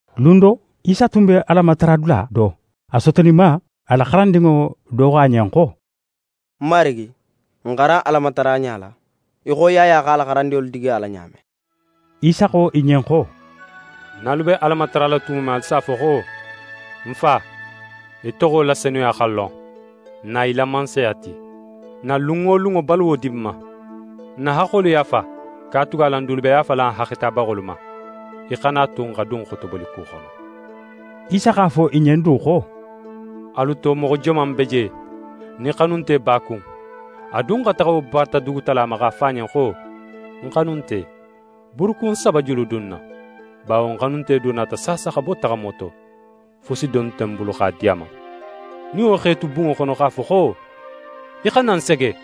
Lun do, Isa tun be Alamatara la dula do. A sotoninma, a la xarandinŋo do xo a ɲen xo: «Marigi, n xaran Alamataraɲa la, í xo Yaya x'a la xarandinŋolu digi a la ɲa men.» Isa xo i ɲen xo: «Nin alu be Ala matarala tumo men, alu s'a fo xo: “N Fa, í toxo la senuya xa lon, na í la Mansaya ti. N na lun wo lunŋo baluwo di n ma. N na haxxolu yaafa, katugala n dulu be yaafala n haxxetabaxolu ma. Í xana a tu n xa dun xotoboliku xono”.» Isa x'a fo i ɲen du xo: «Alu to moxo joman be je, nin xanunte b'a kun, a dun xa taxa wo bata dugutala ma, x'a fo a ɲen xo: “Ń xanunte, buurukun saba juludun ń na, bawo ń xanunte do nata saasa xa bo taxamo to. Fusi dun nte ń bulu x'a di a ma.” Nin wo x'é tu bunŋo xono x'a fo xo: “Í xana ń sege.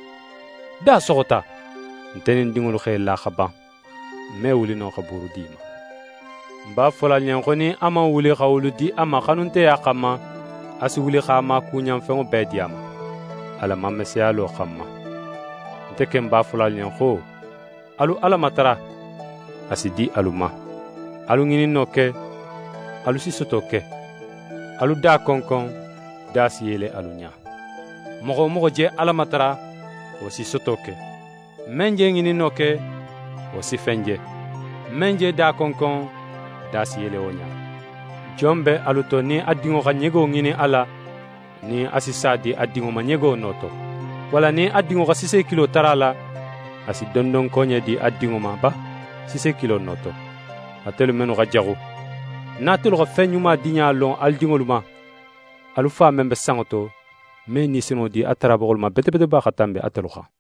Da soxota; nte nin ń dinŋolu x'e la xa ban. Ń me wuli no xa buuru di í ma.” Ń b'a fola alu ɲen xo nin a man wuli xa wolu di a ma xanunteya xanma, a si wuli x'a maakuɲanfenŋo bee di a ma, a la mameseyalo xanma. «Nte ken b'a fola alu ɲen xo, alu Ala matara, a si di alu ma; alu ŋininno ke, alu si soto ke; alu da konkon, da si yele alu ɲa. Moxo wo moxo je Ala matara, wo si soto ke; men je ŋininno ke, wo si fen je; men je da konkon, da si yele wo ɲa. Jon be alu to nin a dinŋo xa ɲego ŋinin a la, nin a si sa di a dinŋo ma ɲego no to? Walla nin a dinŋo xa sisekilo tara a la, a si dondonkoɲe di a dinŋo ma ba sisekilo no to? Atelu mennu xa jaxu, nin atelu xa fen ɲuma diɲa lon alu dinŋolu ma, alu Fa men be sanŋo to me Ni Senunŋo di a tarabaxolu ma bete bete ba xa tanbi atelu xan?»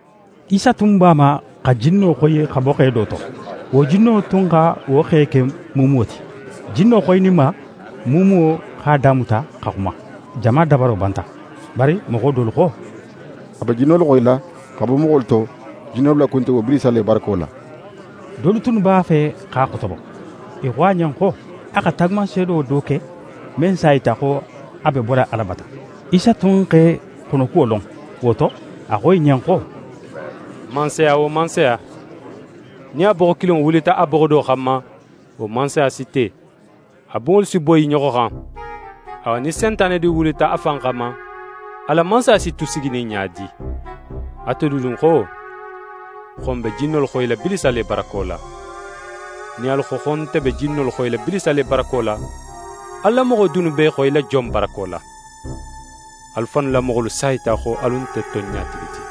Isa tun b'a ma xa jinno xoyi x'a bo xe do to. Wo jinno tun xa wo xe ke muumuwo ti. Jinno xoyininma, muumuwo x'a damuta xa xuma. Jama dabaro banta. Bari moxo dolu xo: «A be jinnolu xoyila xa bo moxolu to, jinnolu la kuntigo Bilisa le barako la.» Dolu tunnu b'a fe x'a xotobo: I xo a ɲen xo a xa taagumanseedo do ke, men s'a yita xo a be bola Ala bata. Isa tun x'e xonokuwo lon. Wo to, a xo i ɲen xo: «Mansaya wo mansaya, nin a boxo kilinŋo wulita a boxo do xanma, wo mansaya si te, a bunŋolu si boyi i ɲoxo xan. Awa, nin Sentane du wulita a fan xanma, a la mansaya si tu siginin ɲa di? Atelu dunnu xo, xo ń be jinnolu xoyila Bilisa le barako la? Nin alu xo, xo nte be jinnolu xoyila Bilisa le barako la, alu la moxo dunnu b'e xoyila jon barako la? Alu fannu la moxolu s'a yita xo alu nte tonɲatigi ti.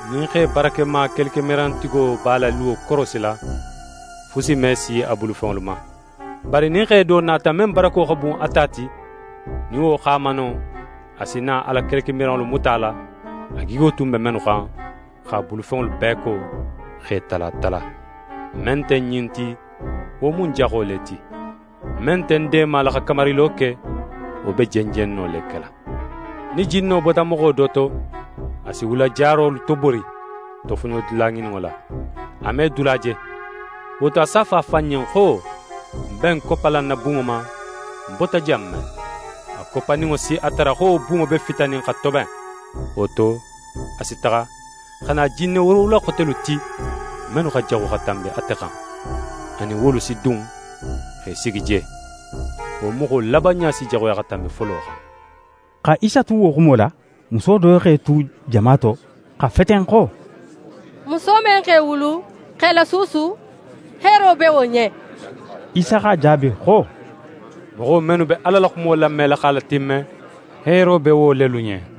«Nin xe barakema kelekemirantigo b'a la luwo korosila, fusi me si a bulufenŋolu ma. Bari nin xe do nata, men barako xa bun a ta ti, nin wo x'a mano, a si na a la kelekemiranŋolu muta a la, a gigo tun be mennu xan, x'a bulufenŋolu bee ko, x'e tala tala. «Men nte ń ɲin ti, wo mu ń jaxo le ti. Men nte ń deemala xa kamarilo ke, wo be jenjenno le kela.» «Nin jinno bota moxo do to, a si wula jarolu tobori, tofoɲodula ŋininŋo la. A me dula je, wo to, a s'a fo a fan ɲen xo: “Ń be ń koppala ń na bunŋo ma, ń bota jan men.” A koppaninŋo si a tara xo wo bunŋo be fitanin xa toben. Wo to, a si taxa, xa na jinne woorowula xotelu ti, mennu xa jaxu xa tanbi ate xan. A nin wolu si dun, x'e sigi je. Wo moxo labanɲa si jaxuya xa tanbi folo xan.» Xa Isa tu wo xumo la, muso do x'é tu jama to xa feten xo: «Muso men x'é wulu, x'é lasuusu, heero be wo ɲen!» Isa x'a jaabi xo: «Moxo mennu be Ala la xumo lamela x'a latimme, heero be wo lelu ɲen.»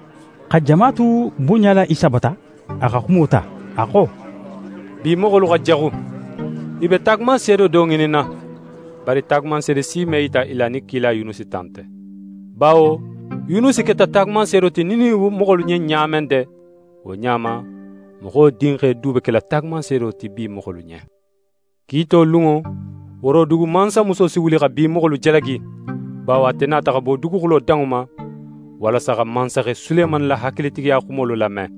Xa jama tu bunɲala Isa bata, a xa xumo ta. A xo: «Bi moxolu xa jaxu. I be taagumanseedo do ŋininna, bari taagumanseede si me yita i la nin kila Yunusi ta nte. Bawo Yunusi keta taagumanseedo ti Niniwe moxolu ɲen ɲa men de, wo ɲa ma Moxo Dinxe du be kela taagumanseedo ti bi moxolu ɲen. Kiito lunŋo, Worodugu mansamuso si wuli xa bi moxolu jalagi, bawo ate nata xa bo duguxulo danŋo ma, walasa xa mansaxe Sulemani la hakilitigiya xumolu lame.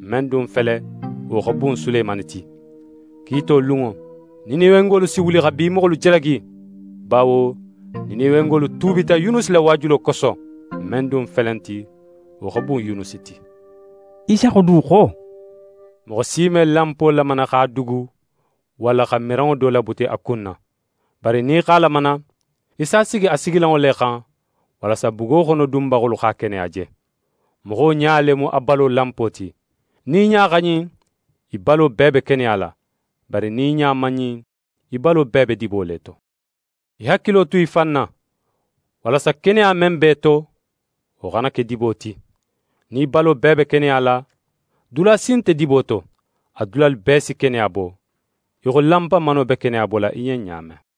Men dun fele, wo xa bun Sulemani ti. Kiito lunŋo, Niniwengolu si wuli xa bi moxolu jalagi, bawo Niniwengolu tuubita Yunusi la waajulo koso. Men dun felenti, wo xa bun Yunusi ti.» Isa xo du xo: «Moxo si me lanpo lamana x'a dugu walla xa miranŋo do labuti a kunna, bari nin í x'a lamana, í s'a sigi a sigilanŋo le xan, walasa bugo xono dunbaxolu x'a keneya je. Moxo ɲa le mu a balo lanpo ti. Nin í ɲa xa ɲin, í balo bee be keneya la, bari nin í ɲa man ɲin, í balo bee be dibo le to. Í hakilo tu í fan na, walasa keneya men be í to, wo xana ke dibo ti. Nin í balo bee be keneya la, dula si nte dibo to, a dulalu bee si keneya bo, í xo lanpamano be keneya bola í ɲen ɲa men.»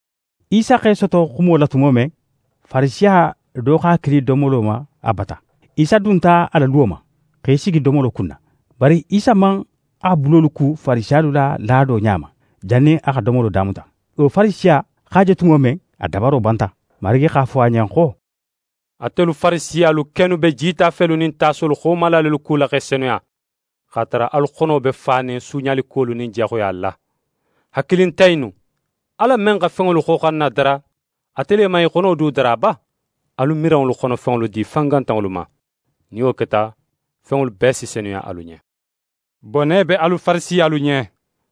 Isa x'é soto xumo la tumo men, Farisiya do x'a kili domolo ma a bata. Isa dunta a la luwo ma, x'é sigi domolo kunna. Bari Isa man a bulolu ku Farisiyalu la laado ɲa ma, jannin a xa domolo damuta. Wo Farisiya x'a je tumo men, a dabaro banta. Marigi x'a fo a ɲen xo: «Atelu Farisiyalu kennu be jitafelu nin tasolu xomala lelu kula x'e senuya, x'a tara alu xono be fanin suuɲalikuwolu nin jaxuya la. Hakilintan innu! Ala men xa fenŋolu xoxanna dara, ate le man i xono du dara ba? Alu miranŋolu xonofenŋolu di fangantanŋolu ma. Nin wo keta, fenŋolu bee si senuya alu ɲen. «Bone be alu Farisiyalu ɲen,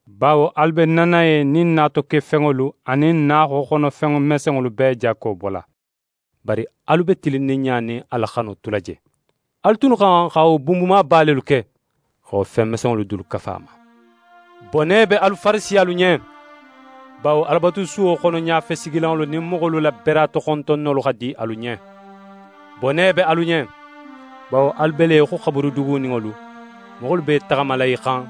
bawo alu be nanaye nin natokefenŋolu anin naaxoxono fen mesenŋolu bee jakko bola, bari alu be tilinninɲa nin Ala xano tula je. Alu tunnu xa xan xa wo bunbumaba lelu ke, xa wo fen mesenŋo dulu kafu a ma. «Bone be alu Farisiyalu ɲen, bawo Alabatusuwo xono ɲafesigilanŋolu nin moxolu la beratoxontonnolu xa di alu ɲen. Bone be alu ɲen, bawo alu be le í xo xaburu duguninŋolu, moxolu be i taxamala i xan,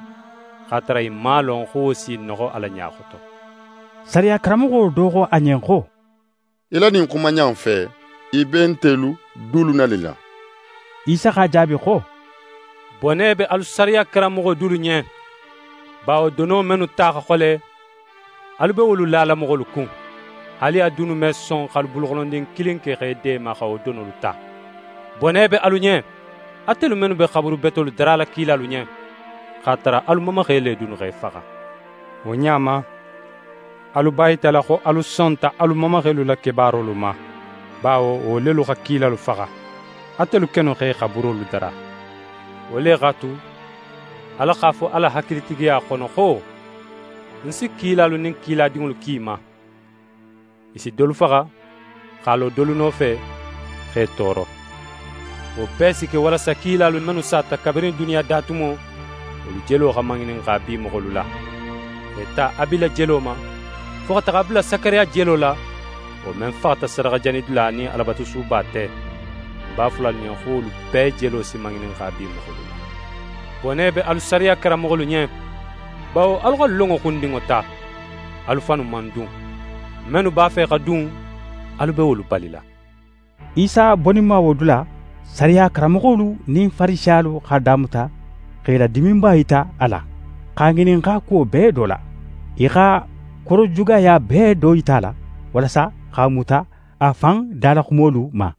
x'a tara i man a lon xo wo s'i noxo Ala ɲa xoto.» Sariya karanmoxo do xo a ɲen xo: «Í la ɲin xumaɲa in fe, í be ntelu dulu nanila!» Isa x'a jaabi xo: «Bone be alu sariya karanmoxolu dulu ɲen, bawo dono mennu ta xa xole, alu be wolu lala moxolu kun. Haali alu dunnu me son x'alu buluxonondin kilin ke x'e deema xa wo donolu ta. Bone be alu ɲen, atelu mennu be xaburu betolu darala kilalu ɲen, x'a tara alu mamaxe le dunnu x'e faxa. Wo ɲa ma, alu b'a yitala xo alu sonta alu mamaxelu la kebaarolu ma, bawo wo lelu xa kilalu faxa. Atelu kennu x'e xaburolu dara. Wo le x'a tu, Ala x'a fo a la hakilitigiya xono xo: “Ń si kilalu nin kiladinŋolu ki i ma. I si dolu faxa, x'a lo dolu nofe, x'e tooro.” Wo bee si ke walasa kilalu mennu sata kabirin duniya da tumo, wolu jelo xa maŋininxa bi moxolu la. X'é ta Abila jelo ma, fo xa taxa a bula Sakariya jelo la, wo men faxata sadaxajanidula nin Alabatusuba te. Ń b'a fola alu ɲen, xo wolu bee jelo si maŋininxa bi moxolu la. «Bone be alu sariya karanmoxolu ɲen, bawo alu xa lonŋo xundinŋo ta. Alu fannu man dun. Mennu b'a fe xa dun, alu be wolu balila.» Isa boninma wo dula, sariya karanmoxolu nin Farisiyalu x'a damuta x'e la diminba yita a la, x'a ŋininxa kuwo bee do la. I xa korojugaya bee do yita a la, walasa x'a muta a fan dalaxumolu ma.